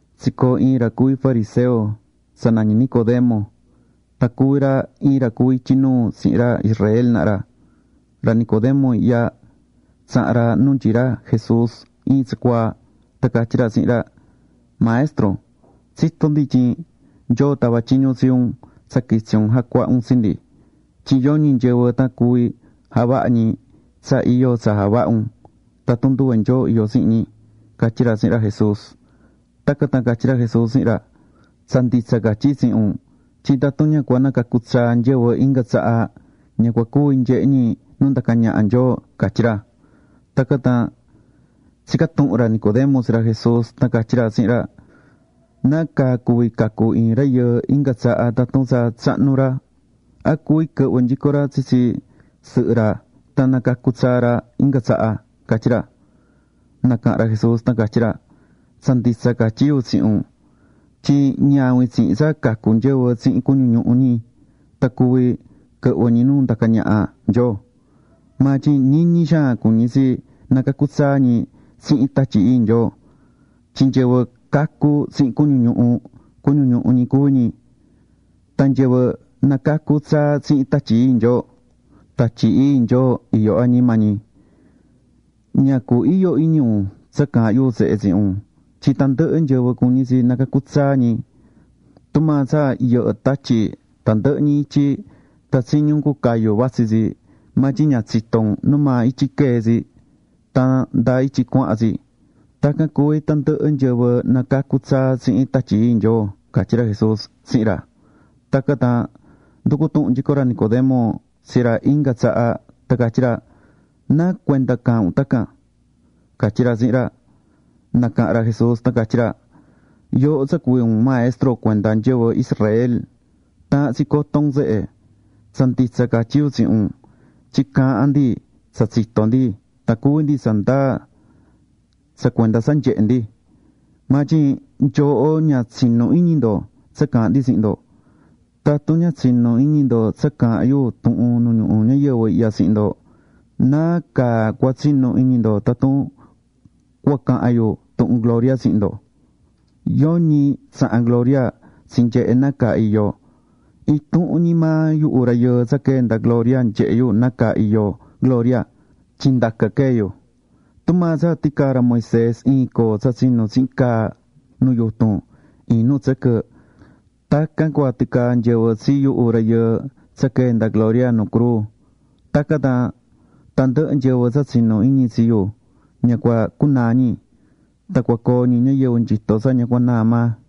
Tsicoo̱ iin ra cuví fariseo tsa nañí Nicodemo. Tan cuví ra iin ra cuví ityi nuu tsihin ra Israel naha ra. Ra Nicodemo ihya, tsaha̱n ra nu nyií ra Jesús iin tsacuaa. Tan catyí ra tsihin ra: ―Maestro, tsitó ndi tyin Nyoo tava̱ tyiñu tsi un tsa quitsi un jacuaha un tsi ndi. Tyin yoñi nyɨvɨ tan cuví javaha ñi tsa iyo tsa javahá un, tatun nduve Nyoo iyó tsihin ñi ―catyí ra tsihin ra Jesús. Tacan tan catyí ra Jesús tsihin ra: ―Tsa nditsa catyí yu tsihin un tyin tatun ña cua nacacu tsaa nyɨvɨ inga tsaha, ña cua cuvi nyehe ñi nu ndacá ñaha Nyoo ―catyí ra. Tacan tan tsica̱ tuhun ra Nicodemo tsi ra Jesús tan catyí ra tsihin ra: ―¿Nacaa cuví cacu iin rayɨɨ inga tsaha tatun tsa tsahnu ra? ¿A cuví quɨhvɨ nyico ra tsitsi sɨhɨ ra tan nacacu tsaa ra inga tsaha? ―catyí ra. Nacaha̱n ra Jesús tan catyí ra: ―Tsa nditsa catyí yu tsihin un tyin ñavin tsihin tsa cacu nyɨvɨ tsihin cuñu ñuhu ñi tan cuví quɨhvɨ ñi nu ndacá ñaha Nyoo. Maa tyin ñiñi xaan cuñí tsi nacacu tsaa ñi tsihin Tatyi Ii Nyoo. Tyin nyɨvɨ cacu̱ tsihin cuñu ñuhu, cuñu ñuhu ñi cuví ñi. Tan nyɨvɨ nacacu̱ tsaa tsihin Tatyi Ii Nyoo, Tatyi Ii Nyoo iyó añima ñi. Ña cu iyo iñi un tsa caahán yu tsehe tsihin un tyin tandɨhɨ nyɨvɨ cuñí tsi nacacu tsaa ñi. Tumaa tsa yɨhɨ́ tatyi tandɨhɨ ñi ityi tan tsiñí un cucayú vatsí tsi, maa tyin ña tsitó un numaa ityi quee̱ tsi, tan ndáa ityi cuahán tsi; tacan cuví tandɨhɨ nyɨvɨ nacacu̱ tsaa tsihin Tatyi Ii Nyoo ―catyí ra Jesús tsihin ra. Tacan tan nducu̱ tuhun nyico ra Nicodemo tsi ra inga tsaha tan catyí ra: ―¿Nacuenda caahán un tacan? ―catyí ra tsihin ra. Nacaha̱n ra Jesús tan catyí ra: ―Yooho tsa cuví un maestro cuenda nyɨvɨ Israel, taahán tsi coto un tsehe. Tsa nditsa catyí yu tsihin un tyin caahán ndi tsa tsitó ndi tan cuví ndi tsa ndaa tsa cuenda tsa nyehe̱ ndi. Maa tyin nyooho ña tsinú iñi ndo tsa caahán ndi tsihin ndo. Tatun ña tsinú iñi ndo tsa caahán yu tuhun nu ñuhu ñayɨvɨ ihya tsihin ndo, ¿nácaa cua tsinu iñi ndo tatun cua cahan yu tuhun gloria tsihin ndo? ’Yoñi tsaha̱n gloria tsinyehe̱ nácaa iyó. Intuhun ñi maa yuhu Rayɨɨ tsa quee̱ nda gloria nyehé yu nácaa iyó gloria, tyin ndacan quee̱ yu. Tumaa tsa ticaa̱ ra Moisés iin coo tsa tsinu̱ tsihin caa nu yutun iin nu tsɨquɨ, tacan cua ticaa nyɨvɨ tsi yuhu Rayɨɨ tsa quee̱ nda gloria nuu cruu. Tacan tan tandɨhɨ nyɨvɨ tsa tsinú iñi tsi yu, ña cua cunaa ñi. Tan cua coo ñi ñayɨvɨ nyito tsa ña cua naa maa.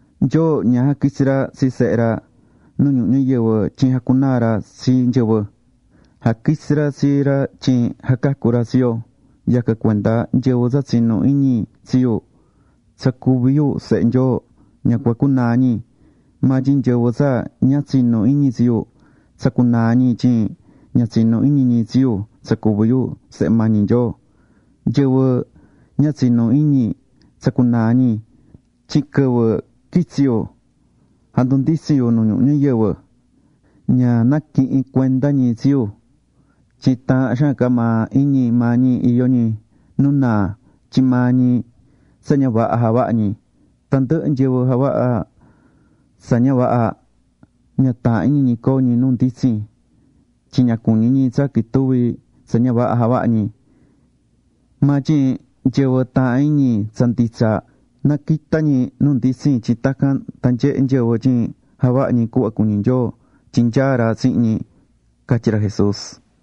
Tyin Nyoo jaquitsi ra tsi Sehe ra nu ñuhu ñayɨvɨ tyin jacacu ra tsi nyɨvɨ, tan ña jaquitsi ra tsi ra tsa jacunaa ra tsi ñi. ’Yacan cuenda nyɨvɨ tsa tsinú iñi tsi yu tsa cuví yu Sehe Nyoo ña cua cunaa ñi, maa tyin nyɨvɨ tsa ña tsinú iñi tsi yu, tsa cunaa̱ ñi tyin ña tsinú iñi ñi tsi yu tsa cuví yu Sehe mañi Nyoo. Nyɨvɨ ña tsinú iñi, tsa cunaa̱ ñi. Tyin quɨvɨ quitsi̱ yu jandunditsi̱n yu nu ñuhu ñayɨvɨ, ña naquihi̱n cuenda ñi tsi yu tyin taahán xaan ca maa iñi maa ñi iyó ñi nu naa tyin maa ñi tsa ña vaha javahá ñi. Tandɨhɨ nyɨvɨ javahá tsa ña vaha, ña taahán iñi ñi coo ñi nu nditsin, tyin ña cuñí ñi tsa quituvi tsa ña vaha javahá ñi. Maa tyin nyɨvɨ taahán iñi tsa nditsa, naquitá ñi nu nditsin tyin tacan tan nyehe nyɨvɨ tyin javahá ñi cuhva cuñí Nyoo tyin nyaá ra tsihin ñi ―catyí ra Jesús.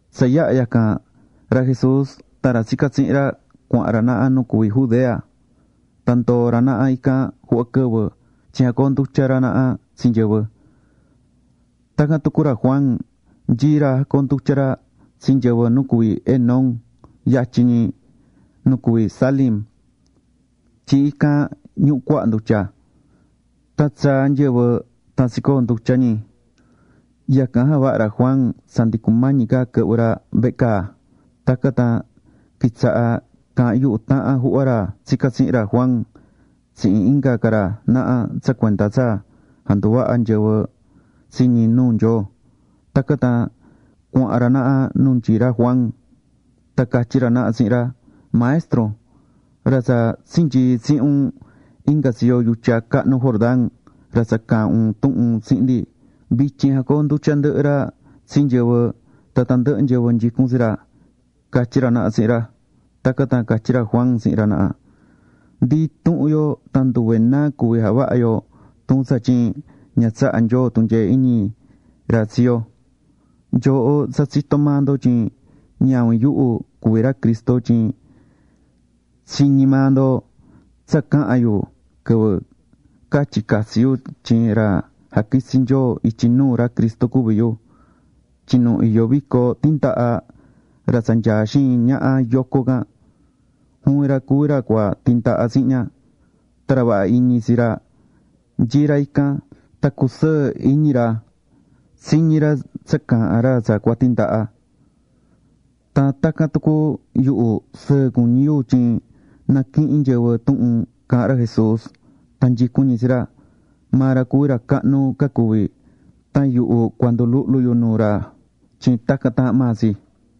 Tsa yaha̱ yacan, ra Jesús tan ra tsicá tsihin ra cuahán ra naha nu cuví Judea. Tan ndoo̱ ra naha ican juhva quɨvɨ, tyin jacoondutyá ra naha tsi nyɨvɨ. Tacan tucu ra Juan nyií ra jacoondutyá ra tsi nyɨvɨ nu cuví Enón yatyin ñi nu cuví Salim, tyin ican ñuhú cuaha ndutya. Tan tsaá nyɨvɨ tan tsicoondutyá ñi. Yacan javaha̱ ra Juan tsa ndi cumañi ca quɨhvɨ ra vehe caa. Tacan tan quitsaha̱ caahán yuhu tahan juhva ra tsicá tsihin ra Juan tsihin inga ca ra naha tsa cuenda tsa janduvaha nyɨvɨ tsi ñi nuu Nyoo. Tacan tan cuahán ra naha nu nyií ra Juan. Tan catyí ra naha tsihin ra: ―Maestro, ra tsa tsinyii̱ tsihin un inga tsiyo yutya cahnu Jordán, ra tsa caha̱n un tuhun tsihin ndi, vityin jacoondutyá ndɨhɨ ra tsi nyɨvɨ tan tandɨhɨ nyɨvɨ nyicún tsi ra ―catyí ra naha tsihin ra. Tacan tan catyí ra Juan tsihin ra naha: ―Ndi intuhun yo tan nduve náa cuví javaha yo, tun tsatyin ña tsahá Nyoo tunyee iñi ra tsi yo. Nyooho tsa tsitó maa ndo tyin ñavin yuhu cuví ra Cristo tyin tsiñi̱ maa ndo tsa caha̱n yu quɨvɨ catyi̱ catsi yu tyin ra jaquitsi̱ Nyoo ityi nuu ra Cristo cuví yu. Tyin nu iyó vico tandaha, ra tsa nyaá xiin ñaha yoco can, juvin ra cuví ra cua tindaha tsihin ña. Tan ra vaha iñi tsi ra nyií ra ican. Tan cusɨɨ́ iñi ra tsiñí ra tsa caahán ra tsa cua tindaha. Tan tacan tucu yuhu, sɨɨ cuñí yu tyin naquihín nyɨvɨ tuhun caahán ra Jesús tan nyicún ñi tsi ra. Maa ra cuví ra cahnu ca cuvi. Tan yuhu cua nduluhlu yu nuu ra tyin tacan taahán maa tsi.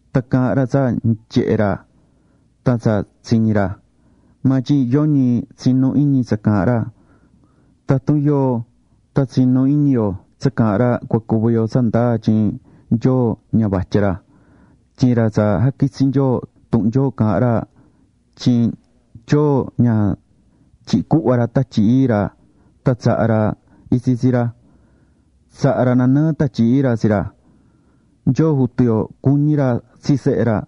Tan caahán ra tsa nyehé ra tan tsa tsiñí ra, maa tyin yoñi tsinú iñi tsa caahán ra. Tatun yoo tan tsinú iñi yo tsa caahán ra, cua cuví yo tsa ndaa tyin Nyoo ña vatya ra. Tyin ra tsa jaquitsi̱ Nyoo, tuhun Nyoo caahán ra tyin Nyoo ña tyihi̱ cuhva ra Tatyi Ii ra tan tsaha̱ ra itsi tsi ra. Tsaha̱ ra nanɨɨ Tatyi Ii ra tsi ra. Nyoo Jutu yo cuñí ra tsi Sehe ra.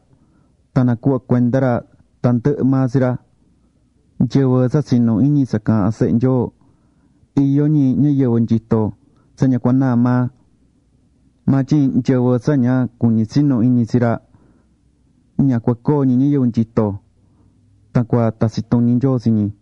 Tan nacuhva̱ cuenda ra tandɨhɨ maa tsi ra. Nyɨvɨ tsa tsinú iñi tsa caahán Sehe Nyoo, iyó ñi ñayɨvɨ nyito tsa ña cua naa maa. Maa tyin nyɨvɨ tsa ña cuñí tsinu iñi tsi ra, ña cua coo ñi ñayɨvɨ nyito. Tan cua tatsi tuñi Nyoo tsi ñi.